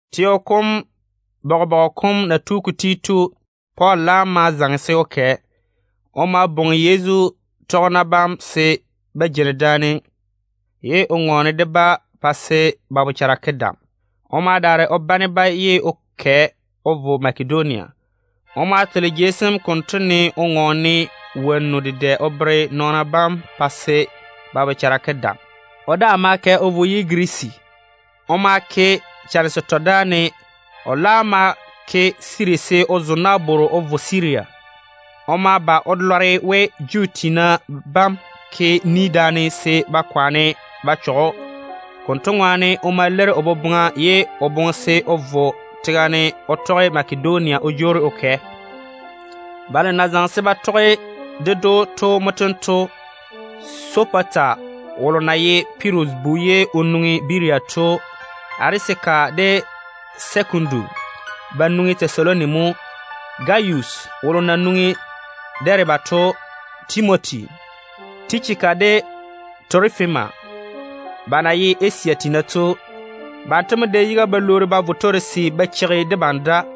Teo kom bobɔga kam na tu ka ti to, Pɔɔl laam ma zaŋe se o kɛ. O ma bwoŋi Yezu tɔgena bam se ba jeini daane, ye o ŋɔɔne de-ba pa se ba bochara ke dam. O ma daare o bane-ba ye o kɛ o vo Makedonia. O ma tole jei sem konto ne o ŋɔɔne wonnu dedɛ o bere nɔɔna bam pa se ba bochara ke dam. O daa ma kɛ o vo o yi Girisi. O ma ke chane setɔ dáane. O laam ma ti o yiga se o zo nabworo o vo Siria. O ma ba o lɔre we Juu tiina bam ke ni daane se ba kwaane ba chɔge‑o. Konto ŋwaane o ma leiri o boboŋa, ye o laam ja se o vo tega ne o tɔge Makedonia wo o jwoori o kɛ. Balo na zaŋe se ba tɔge ded‑o to mo tento: Sopata, wolo na ye Pirus bu ye o nwoŋi Berea to. Arisaka de Sɛkundu, ba nwoŋi Tɛsaloni mo. Gayus, wolo na nwoŋi Dɛɛbe to. Timoti. Tichika de Torofima, ba na ye Asia tiina to. Banto mo dɛ yiga ba lwoori ba vo Torase ba cheigi debam da.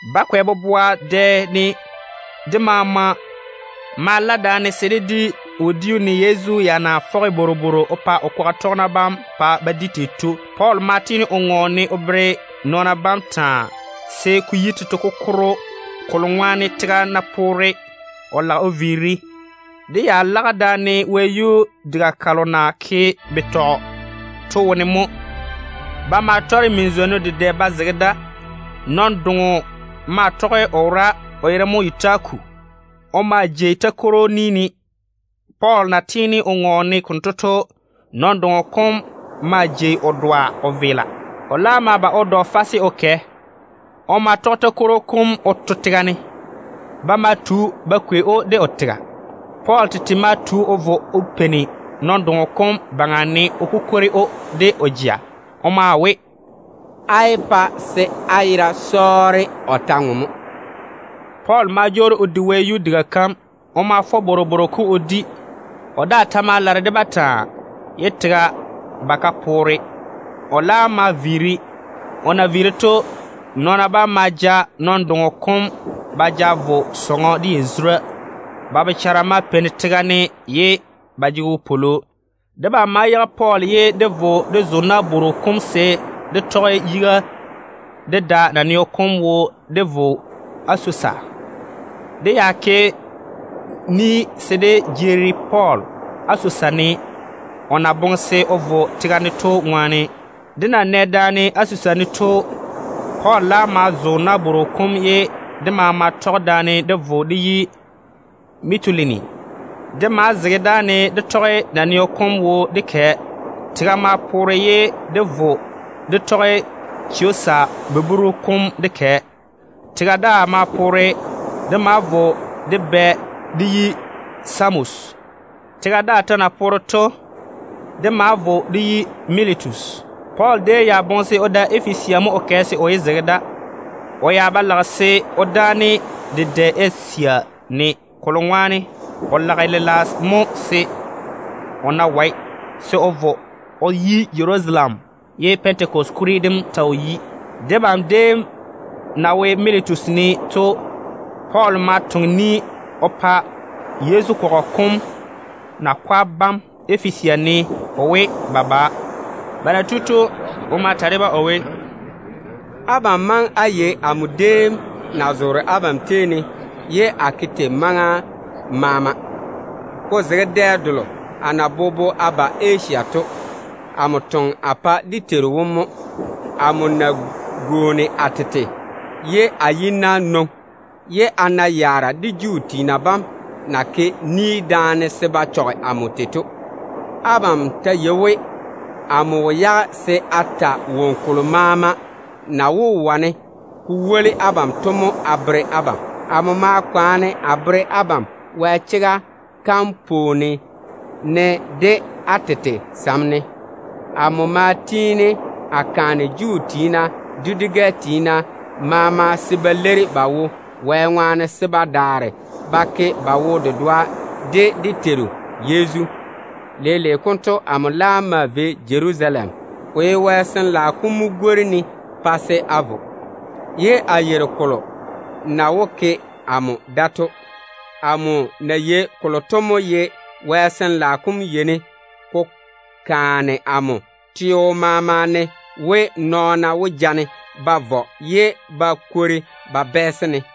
Bakwɛ boboa dɛ ne debam maama ma la daane se dé di wodiu, ne Yezu ya na fɔge bworobworo o pa o kwaga tɔgena bam pa ba di tei to. Pɔɔl ma tiini o ŋɔɔne o bere nɔɔna bam taa, se ko yi tete kokoro, kolo ŋwaane tega ná poore o lage o viiri. Dé ya lage daane wɛyuu diga kalo na ke betɔ to wone mo. Ba déem tɔre min-zwonnu dedɛ ba zege da. Nɔn-doŋo maa tɔge o wora, o yere mo Yutiku. O maa jei takworo ni ne. Pɔɔl na tiini o ŋɔɔne o dáane konto to, nɔn-doŋo kom maa jei o dɔa o veela. O laam ma ba o dɔ fase o kɛ. O ma tɔge takworo kom o to tega ne. Ba ma tu ba kwei‑o de o tega. Pɔɔl tete ma tu o vo o peini nɔn-doŋo kom baŋa ne o kukwori‑o de o jea. O maa we, “Á yé pa se á yera sɔɔre. O ta ŋwe mo.” Pɔɔl ma jwoori o di wɛyuu diga kam. O ma fɔ bworobworo kom o di. O daa ta ma lare de-ba taa, ye tega ba ka poore. O laam ma viiri. O na viiri to, nɔɔna bam ma ja nɔn-doŋo kom ba ja vo sɔŋɔ de yazura. Ba bochara ma peini tega ne ye ba jege wopwolo. Debam ma yage Pɔɔl ye dé vo dé zo nabworo kom se dé tɔge yiga dé da naneo kom wo dé vo Asosa. Dé ya ke ni daane se dé jeeri Pɔɔl Asosa ne, o na boŋe se o vo tega ne to ŋwaane. Dé na nɛ daane Asosa ne to, Pɔɔl laam ma zo nabworo kom ye dé maama tɔge daane dé vo dé yi Mitulini. Dé ma zege dáane dé tɔge naneo kom wo dé kɛ. Tega ma poore ye dé vo dé tɔge Chiosa buburu kom dé kɛ. Tega daa ma poore. Dé ma vo dé bɛ dé yi Samos. Tega daa ta na poore to, dé ma vo dé yi Militus. Pɔɔl déem ya boŋe se o da Efesia mo o kɛ se o yé zege da. O ya ba lage se o dáane dedɛ Asia ne, kolo ŋwaane o lage lela mo se o ná wae, se o vo o yi Jerusalem ye Pɛntekɔse kuri dem ta wo yi. Debam déem na wo Militus ne to, Pɔɔl ma toŋe ni o pa Yezu kɔgɔ kom nakwa bam Efesia ne o we, ba ba. Ba na tu to, o ma ta de-ba o we, “Abam maŋe á yei amo déem na zoore abam tei ne ye a ke tei maŋa maama, ko zege dɛ delo a na bobo a ba Asia to. Amo toŋe a pa dé Teiru wom mo. Amo ma gwooni a tete, ye a yi-na nwoŋi. A ma na yaara dedɛ de Juu tiina bam na ke ni daane se ba chɔge amo tei to. Abam ta yei we, amo wo yage se a ta woŋo kolo maama na wó wane ko woli abam to mo a bere abam. Amo ma kwaane a bere abam Wɛ chega kam pwooni yiga ne, de á tete sam ne. Amo ma tiini a kaane Juu tiina de dwi-gɛ tiina maama se ba leiri ba wo Wɛ ŋwaane, se ba daare ba ke ba wo-dedoa de dé Teiru Yezu. Leile konto amo laam maa vei Jerusalem. Ko nam ye Wɛ Sin-laao kom mo gwori-ne pa se a maa vei da, ye a yeiri kolo na wó yi amo da to. Amo na yei kolo to mo ye Wɛ Sin-laao kom yeini ko kaane amo teo maama ne we, nɔɔna wó ja-ne ba vɔ ye ba kwori ba bɛɛse-ne.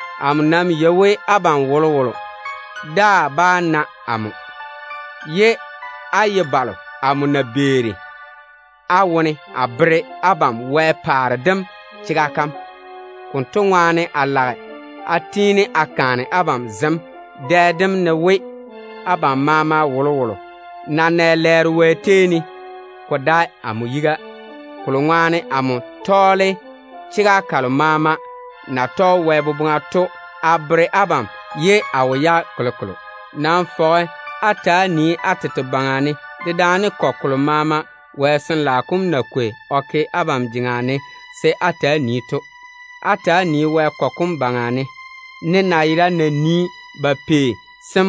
Amo nam yei we abam wolowolo daa bá na amo, ye á ye balo amo na beeri á wone a bere abam Wɛ paare dem chega kam. Konto ŋwaane a lage a tiini a kaane abam zem dɛ dem ne we, abam maama wolowolo ná nɛ lɛɛro Wɛ tei ne, ko dae amo yiga. Kolo ŋwaane amo tɔɔle chega kalo maama na tɔge Wɛ boboŋa to a bere abam ye a wo yage kolokolo. Nam fɔge á ta‑á nii á tete baŋa ne dedaane kɔgɔ kolo maama Wɛ Sin-laao kom na kwei o ke abam jeŋa ne se á ta‑á nii to. Ta‑á nii-na Wɛ kɔgɔ kom baŋa ne, ne nayera na nii ba pei sem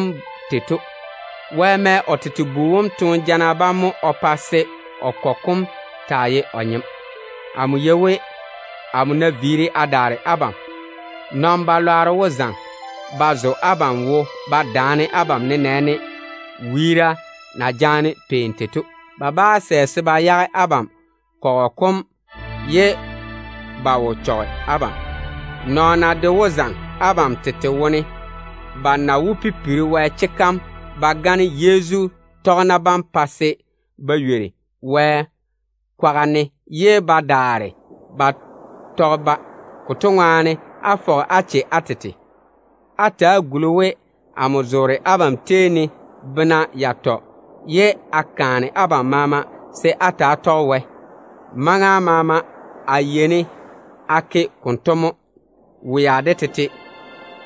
tei to. Wɛ tɔge o tete bu wom toone jana bam ŋwaane mo o pa se o kɔgɔ kom ji o tete nyem. Amo yei we, amo ná viiri a daare abam, nɔn-balwaaro wó zaŋe ba zo abam wo ba daane abam, nenɛɛne wiira na jaane pei tei to. Ba bá sɛ se ba yage abam kɔgɔ kom ye ba wo chɔge abam. Nɔɔna de wó zaŋe abam tete wone ba na wó pipiri Wɛ chega kam ba gane Yezu tɔgena bam pa se ba ywori Wɛ kwaga ne ye ba daare ba tɔge-ba. Konto ŋwaane fɔge-na á che á tete. Ta‑á guli-na we amo zoore abam tei ne bena yatɔ ye a kaane abam maama se á ta‑á tɔge Wɛ. Maŋa maama a yeini a ke konto mo, wea de tete,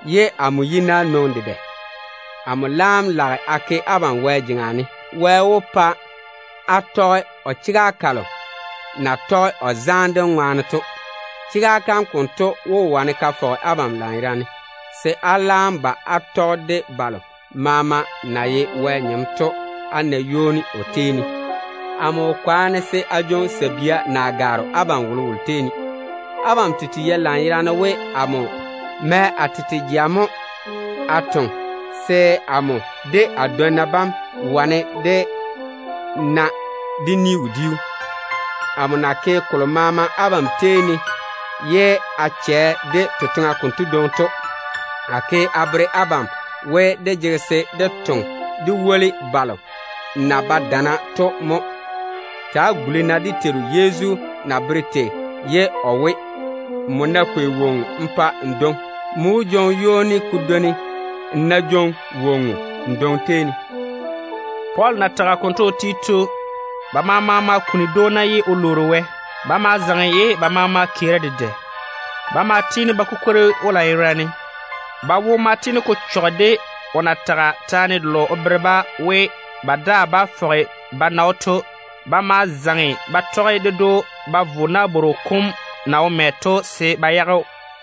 ye a ka yi-na dedɛ. Amo laam lage a ke abam Wɛ jeŋa ne. Wɛ wó pa á tɔge chega kalo na tɔge o zaane dem ŋwaane to. Chega kam konto wó wane ka fɔge abam lanyerane, se á laam ba á tɔge de balo maama na ye Wɛ nyem to á na ywoni o tei ne. Amo nam wo kwaane se a jwoŋi sabia na gwaaro abam wolowolo tei ne. Abam tete yei lanyerane we amo mɛ a tete jea mo a toŋe, se amo de a dwonna bam wane dé na dé ni-wodiu. Amo na ke kolo maama abam tei ne ye a chɛ de totoŋa konto dwoŋi to, a ke a bere abam we, dé jege se dé toŋe dé woli balo na ba dana to mo. Ta‑á guli-na dé Teiru Yezu na bere tei ye o we, ‘Nmo ná kwei woŋo n pa n dwoŋi, nmo wó jwoŋi ywoni ko dwoni n ná jwoŋi woŋo n dwoŋi tei ne.’” Pɔɔl na tage konto o ti to, ba maama ma kuni dwoona ye o lwoori Wɛ. Ba ma zaŋe ye ba maama keeri dedɛ. Ba ma tiini ba kukwori‑o lanyerane. Ba wo ma tiini ko chɔge de o na tage taane delo o bere-ba we, ba daa bá fɔge ba na‑o to. Ba ma zaŋe ba tɔge ded‑o ba vo nabworo kom na wo mɛ to se ba yage‑o.